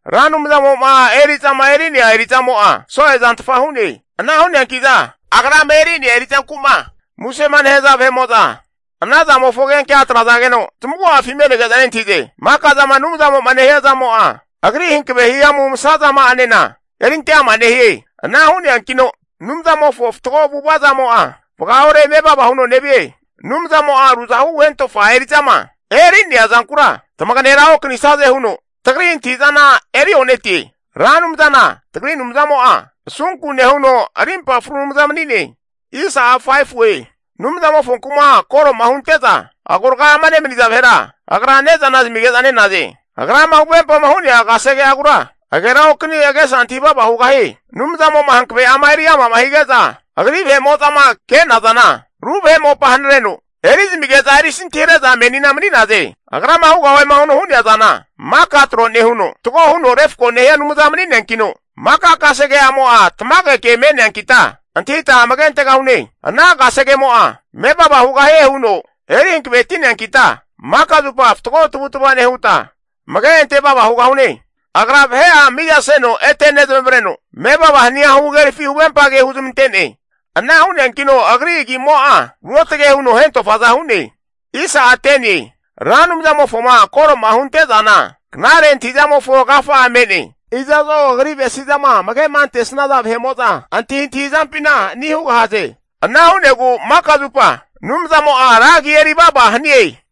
Ra Anumzamo'ma eri'zama eri'nea eri'zamo'a, so'e zantfa hu'ne. Ana hu'neanki'za agrama eri'nea eri'zanku'ma musema nehaza vahe'mo'za, ana zamofo agenkea atrazageno zamagu'afi me'nege'za nentahize. Maka zama Anumzamo'ma nehia zamo'a agri hankave hihamu masa zama'anena erinte ama nehie. Ana hu'neankino Anumzamofo fatgo avu'ava zamo'a, vagaore mevava huno nevie. Anumzamo'a ruzahu hentofa eri'zama eri'nea zankura, tamaganera okanisie huno tagri antahi'zana eri o'netie. Ra Anumzana tagri Anumzamo'a asunku nehuno arimpa fru Anumza mani'ne. Anumzamofonku'ma koro'ma hunte'za agorga'ama nemaniza vahera, agra ne'zana zamige'za nenaze. Agrama huvempama hu'nea kasege'agura agera okani agesa antahi vava hugahie. Anumzamo'ma hankave'ama eri ama hige'za agri vahe'mo'zama ke'nazana, ru vahe mopa hanareno, eri zamige'za erisantihare'za menina mani'naze. Agrama hugahue huno'ma hu'nea zana maka tro nehuno, fatgo huno refko nehia Anumza mani'neankino, maka kasege'amo'a tamage ke me'neankita antahita amage antegahune. Ana kasegemo'a mevava hugahie huno eri hankaveti'neankita, maka zupa fatgo tavutva nehuta amage ante vava hugahune. Agra vahe'a mizaseno ete nezamavareno, mevava hania huhagerafi huvempage huzmante'ne. Ana hu'neankino agri agimo'a, ruotage huno hentofaza hu'ne. Ra Anumzamofoma koro'ma hunte'zana, knare antahi'zamofo agafa'a me'ne. Iza'zo agri avesi'zama amage'ma antesnaza vahe'mo'za antahintahi zampina ani hugahaze. Ana hu'negu maka zupa Anumzamo'a ra agia eri vava hanie.